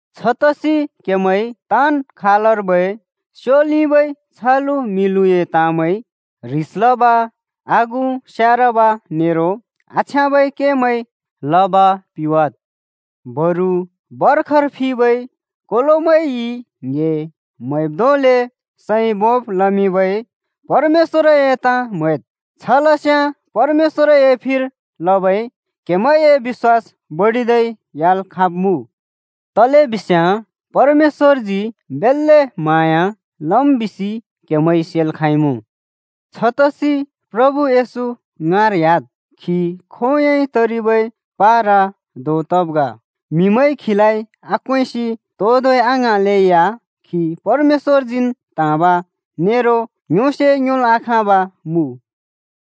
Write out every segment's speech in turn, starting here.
छतसि क्‍हेमैंइ ताँन् खालर्बै स्योलिबै छलु-म्हिलुए ताँमैं, ह्रिस लब, आगु स्यारब नेरो आछ्याँबै केमैं लब पिवाद्। बरु भर्खर फिबै कोलोमैंइ ङ्‍हे म्हैब् धोंले सैं भोंब् लमिंबै परमेश्‍वरए ताँ म्हैद्। छ लस्याँ परमेश्‍वरए फिर लबै क्हेमैंए बिश्‍वास बडिदै ह्‍याल् खाँब्मुँ। तलेबिस्याँ परमेश्‍वरजी बेल्‍ले म्हाँया लम् बिसि क्‍हेमैंइ सेल् खाँइमुँ। छतसि प्रभु येशू ङाँर ह्‍याद्। खी खोंयोंइ तरिबै पारा धों तब् ग। म्हिमैंइ खीलाइ आक्वेंसि तो धोंइ आङ्हाँलैया खी परमेश्‍वरजीन् त्हाँब नेरो योंसे योंल् आखाँब मुँ।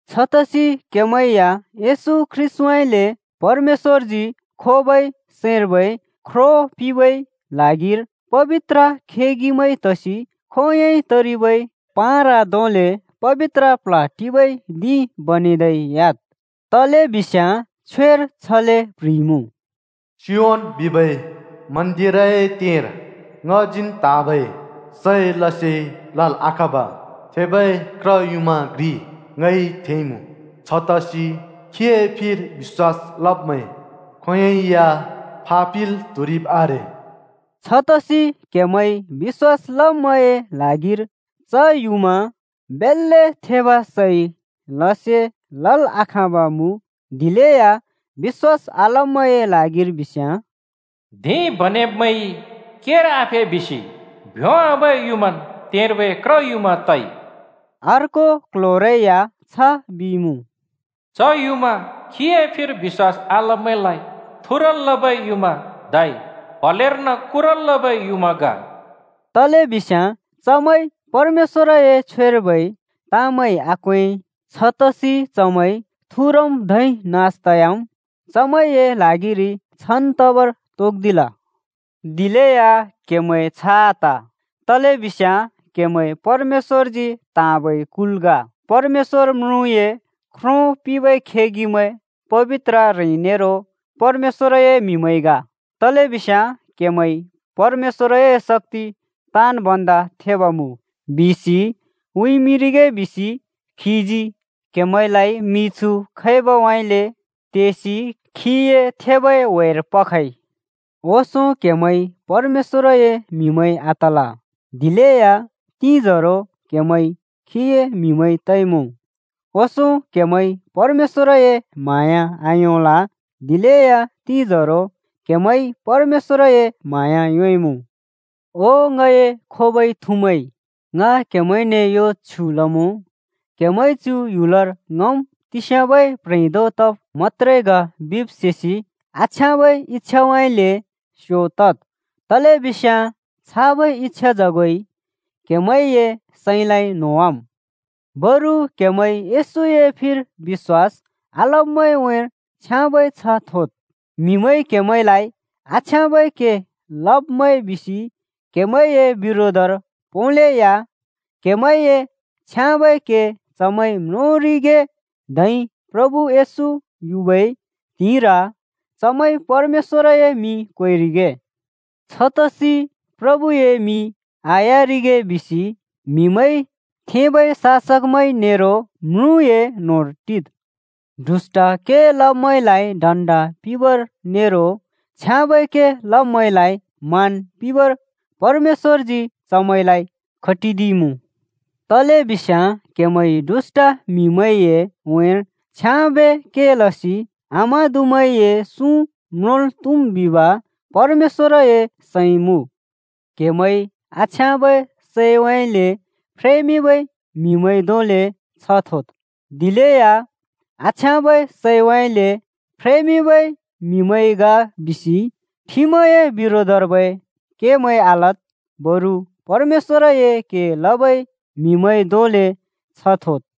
छतसि क्हेमैं या येशू ख्रीष्‍टउँइँले परमेश्‍वरजी खोबै सैंर्बै ख्रो पिंबै ल्हागिर पबित्र खेगिमैं तसि खोंयोंइ तरिबै पारा धोंले पबित्र प्ल्ह टिबै धिं बनेदै ह्‍याद्। तलेबिस्याँ छ्वेर छले प्ह्रिइमुँ: “सियोन बिबै मन्‍दिरए तेंर ङजीन् त्हाँबै सै लसे लल् आखाँब थेबै क्र युमाँ घ्रि ङइ थेंइमुँ। छतसि खीए फिर बिश्‍वास लब्मैं खोंयोंइ या फापिल् त्हुरिब् आरे।” छतसि क्हेमैं बिश्‍वास लब्मैंए ल्हागिर च युमाँ बेल्‍ले थेब सै लसे लल् आखाँब मुँ, दिलेया बिश्‍वास आलब्मैंए ल्हागिर बिस्याँ, “धिं बनेब्मैंइ केर आफे बिसि भ्योंवाबै युँमान् तेंर्बै क्र युँमा तइ।” अर्को क्ल्ह्‍योरै या छ बिइमुँ, “च युमाँ खीए फिर बिश्‍वास आलब्मैंलाइ थुरल् लबै युँमा धै प्हलेर्न कुरल् लबै युँमा ग।” तलेबिस्याँ चमैंइ परमेश्‍वरए छ्वेर्बै ताँमैं आक्वें। छतसि चमैं थुरम् धै नास तयाम्। चमैंए ल्हागिरि छान् तबर तोक्दिल। दिलेया क्‍हेमैं छ आत, तलेबिस्याँ क्‍हेमैं परमेश्‍वरजी त्‍हाँबै कुल ग, परमेश्‍वर म्रुँए ख्रो पिंबै खेगिमैं, पबित्र ह्रें नेरो परमेश्‍वरए म्हिमैं ग। तलेबिस्याँ क्‍हेमैंइ “परमेश्‍वरए शक्‍ति ताँन् भन्दा थेब मुँ” बिसि उँइँमिंरिगे बिसि खीजी क्‍हेमैंलाइ मिछु खैबउँइँले तेसि खीए थेबै ह्‍वेर पखइ। ओंसों क्‍हेमैं परमेश्‍वरए म्हिमैं आतल, दिलेया तिंजोरो क्हेमैं खीए म्हिमैं तइमुँ। ओंसों क्हेमैंइ परमेश्‍वरए म्हाँया आयोंल, दिलेया तिंजोरो क्‍हेमैंइ परमेश्‍वरए म्हाँया योंइमुँ। ओ ङए खोबै थुमैं, ङ क्हेमैंने यो छ्युँ लमुँ, क्‍हेमैंइ चु ह्‍युलर ङम् तिस्याबै प्ह्रें धों तब् मत्‍त्रे ग बिब् सेसि आछ्याँबै इच्‍छाउँइँले स्‍यो तद्, तलेबिस्याँ छाबै इच्‍छाजगोइ क्‍हेमैंए सैंलाइ न्होंवाम्। बरु क्‍हेमैं येशूए फिर बिश्‍वास आलब्‍मैंए उँइँर छ्याँबै छ्ह थोद्। म्हिमैंइ क्‍हेमैंलाइ आछ्याँबै के लब्मैं बिसि क्हेमैंए बिरोधर पोंलेया क्हेमैंए छ्याँबै के चमैंइ म्रोंरिगे धै प्रभु येशू युबै त्हिंइर चमैंइ परमेश्‍वरए मिं क्वेरिगे। छतसि प्रभुए मिं आह्‍यारिगे बिसि म्हिमैंइ थेंबै शासकमैं नेरो म्रुँए न्होंर टिद्। दुष्‍ट के लब्मैंलाइ दण्ड पिंबर नेरो छ्याँबै के लब्मैंलाइ मान पिंबर परमेश्‍वरजी चमैंलाइ खटिदिइमुँ। तलेबिस्याँ क्हेमैंइ दुष्‍ट म्हिमैंए उँइँर छ्याँबे के लसि आमादुमैंए सुँ म्रुल् त्हुम् बिब परमेश्‍वरए सैं मुँ। क्‍हेमैं आछ्याँबै सैउँइँले फ्रेमिंबै म्हिमैं धोंले छ्ह थोद्। दिलेया आछ्याँबै सैउँइँले फ्रेमिंबै म्हिमैं ग बिसि ठिमए बिरोधर्बै केमैं आलद्। बरु परमेश्‍वरए के लबै म्हिमैं धोंले छ्ह थोद्।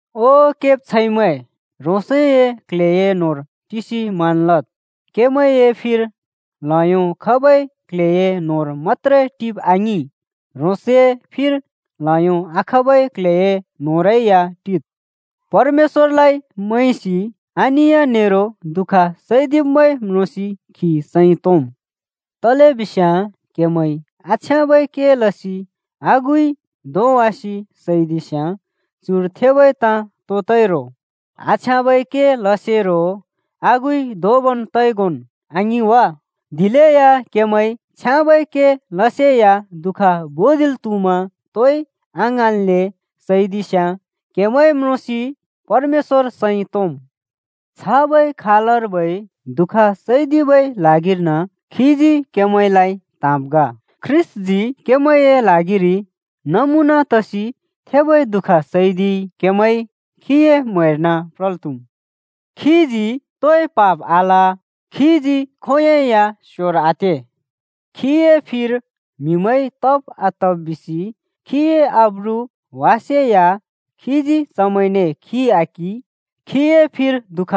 ओ केब्छैंमैं, ह्रोंसए क्ल्हेए न्होंर टिसि मान लद्। क्हेमैंए फिर ल्हयो खबै क्ल्हेए न्होंर मत्‍त्रे टिब आङिं, ह्रोंसए फिर ल्हयो आखबै क्ल्हेए न्होंरै या टिद्। परमेश्‍वरलाइ मैंसि अनिय नेरो दुःख सैदिब्मैं म्रोंसि खी सैं तोंम्। तलेबिस्याँ क्‍हेमैंइ आछ्याँबै के लसि आगुइ धोंवासि सैदिस्याँ चुर थेबै ताँ तो तइ रो? आछ्याँबै के लसेरो आगुइ धोंबन् तइगोंन् आङिं वा? दिलेया क्हेमैंइ छ्याँबै के लसेया दुःख भुँदिल् त्हुमा तोइ आङ्हाँनले सैदिस्याँ क्‍हेमैं म्रोंसि परमेश्‍वर सैं तोंम्। छाबै खालर्बै दुःख सैदिबै ल्हागिर्न खीजी क्‍हेमैंलाइ त्‍हाँब् ग। ख्रीष्‍टजी क्‍हेमैंए ल्हागिरि नमुना तसि थेबै दुःख सैदिइ, क्हेमैं खीए म्‍हैर्न प्रल् त्हुम्। खीजी तोइ पाप आल, खीजी खोंयोंइ या स्‍योर आते। खीए फिर म्हिमैंइ तब आतब बिसि खीए आब्रु वासेया खीजी चमैंने खि आकिं। खीए फिर दुःख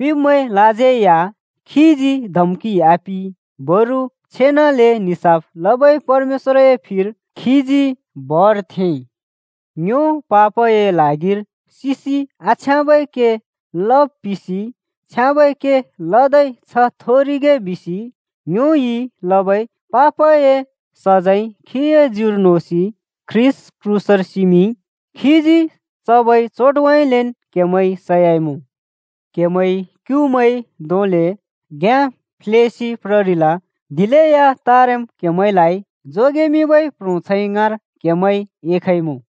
पिंब्मैंलाज्यै या खीजी धम्कि आपिं। बरु छेनाले निसाफ लबै परमेश्‍वरए फिर खीजी भर थेंइ। ङ्यो पापए ल्हागिर सिसि आछ्याँबै के लब् पिसि छ्याँबै के लदै छ्ह थोरिगे बिसि ङ्योइ लबै पापए सजैं खीए ज्युर नोसि ख्रीष्‍ट क्रूसर सिमिंइ। खीजी चबै चोटउँइँलेन् क्‍हेमैं सयाइमुँ। क्‍हेमैं क्युमैं धोंले घ्‍याँ फ्ल्येसि प्ररिल। दिलेया तारेम् क्हेमैंलाइ जोगेमिंबै प्ह्रोंछैं ङाँर क्हेमैं एखइमुँ।